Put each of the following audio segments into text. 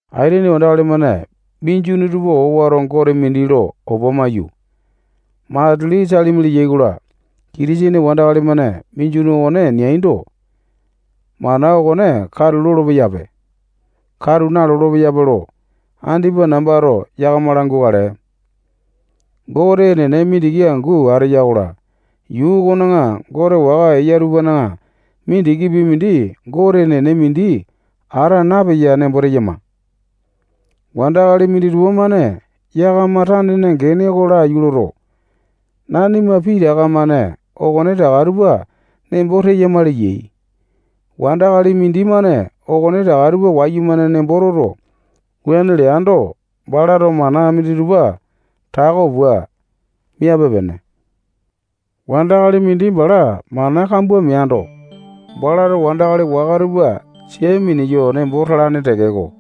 Aitene wandakali-mane minjuni tupa owato gote mindi lo opa maiyu, matili salimi leyai-kola, Kitisene wandakali-mane minjuni okone neaindo, mana okone katu lolo-peyape, katu nalolo-peyape lo andipa nambato yakama langukale. Gote enene mindiki angu ateya-kola, yuu okona gote waka eya tupana mindikipi mindi Gote enene mindi ata napeya nembo teyama. Wandakali minditupa-mane yakama tanena gene oko laiyu loto, nanima pitaka-mane okonetaka tupa nembo teyama leyai. Wandakali mindimane okonetaka tupa wayumane nembo toto, wuane leando, balato mana minditupa tako pua miape-pene. Wandakali mindi bala mana kambua meando, balato wandakali waka tupa sia mineyo nembo talane tekeko,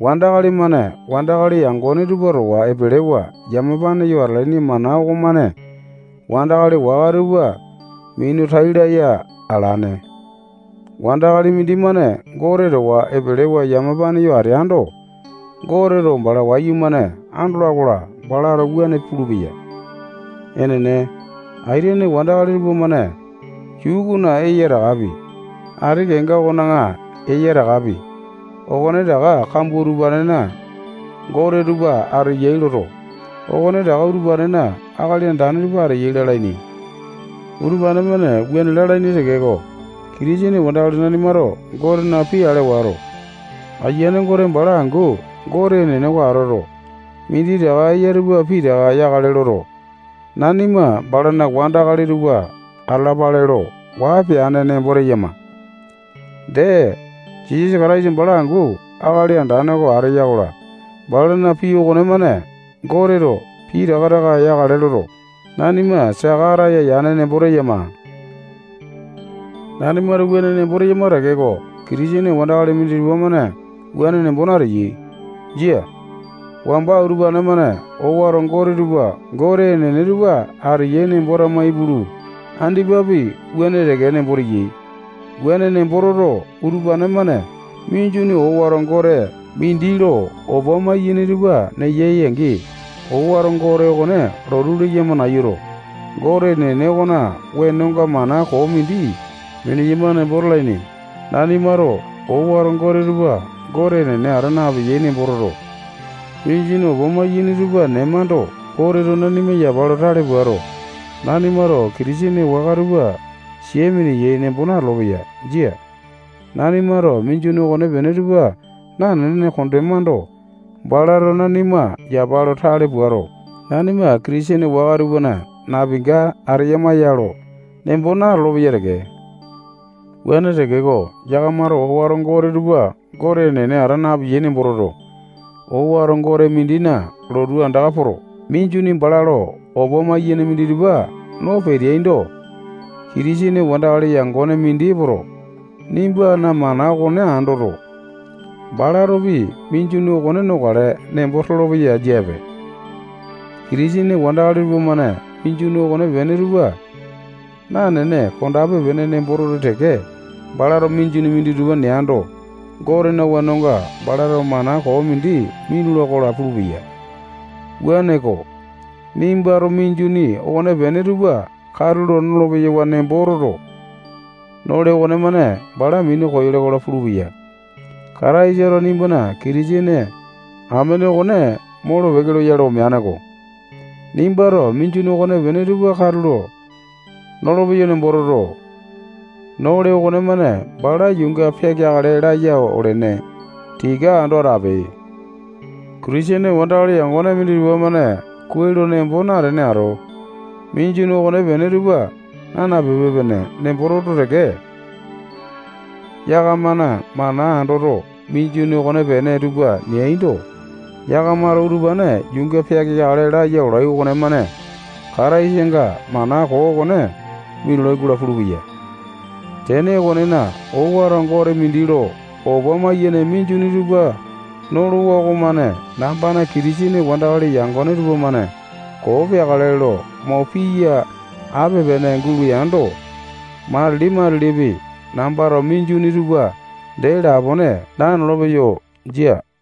wandakali-mane wandakali yangone tupa towa epelewa yamapane yo atalaini mana okomane wandakali waka tupa minu tai laya alane. Wandakali mindimane Gote towa epelewa yamapane yo ateando, Goteto bala wayumane andola-kola, balato wuane pulupeya. Enene, aitene wandakali tupamane yuu okona eya takapi, ati kenga okona eya takapi, okonetaka kambua utupanena gote tupa ateyai loto, okonetaka utupanena akali andane tupa ateyai lalaini. Utupane-mane wuane lalaini tekeko, Kitisene wandakali nanimato Gotena pii ale wato, Ayiane Gote bala angu Gote enene oko atoto, minditaka eya tupa pitaka yakale loto, nanima balana wandakali tupa atalapale lo waa peane nembo teyama. Dee, Jisasa Kataisa bala angu Akali Andane oko ateya-kola, balana pii okonemane Goteto pitaka taka yakale loto, nanima saka ataya yane nembo teyama. Nanimato wuane nembo teyama tekeko, Kitisene wandakali minditupa-mane wuane nembo nateyai. Jia. Wamba utupane-mane owato gote tupa Gote enene tupa ateyai nembo tama ipulu, andipapi wuane teke nembo teyai. Wuane nembo toto, utupane-mane minjuni owato gote mindi lo opa maiyene tupa neyai-angi, owato gote okone lotu leyama nayuto, Gote enene okona wenonga mana koo mindi mineyama nembo talaini. Nanimato owato gote tupa Gote enene ata napeyai nembo toto, minjuni opa maiyene tupa nemando, Goteto nanima yapa lo tale puato, nanimato Kitisene waka tupa sia mineyai nembo natolo-peya. Jia. Nanimato minjuni okonepene tupa nanene kondemando, balato nanima yapa lo tale puato, nanima Kitisene waka tupana napinga ateyama ya lo nembo natolo-peya teke. Wuane tekeko, yakamato owato gote tupa Gote enene ata napeyai nembo toto, owato gote mindina lotu andaka poto, minjuni bala lo opa maiyene minditupa no peteaindo, Kitisene wandakali yangone mindi epoto, nimbana mana okone andoto, balatopi minjuni okone nokale nembo tolopeya jiape. Kitisene wandakali tupamane minjuni okonepene tupa nanene kondape-pene nembo toto teke, balato minjuni minditupa neando, Gotena wenonga balato mana koo mindi minula-kola pulupeya. Wuaneko, nimbato minjuni okonepene tupa katulo nolo-peyawa nembo toto, nole okonemane bala minu koyole-kola pulupeya. Kataisato nimbana Kitisene amene okone molo-peke loyale omeane-ko. Nimbato minjuni okonepene tupa katulo nolopeyo nembo toto, nole okonemane bala yuunga peakeakale laya olene. Tika ando atape. Kitisene wandakali yangone minditupa-mane kuai lo nembo natene ato, minjuni okonepene tupa naa napipe-pene nembo toto teke, yakamana mana andoto, minjuni okonepene tupa neaindo, yakamato utupane yuunga peakeakale laya olai okonemane Kataisanga mana koo okone minulai-kola pulupeya. Tene okonena, owato gote mindi lo opa maiyene minjuni tupa nolowa okomane nambana Kitisene wandakali yangone tupamane koo peakale lo mo piya ape-pene guleando, matili-matilipi nambato minjuni tupa dee lapone nanolopeyo. Jia.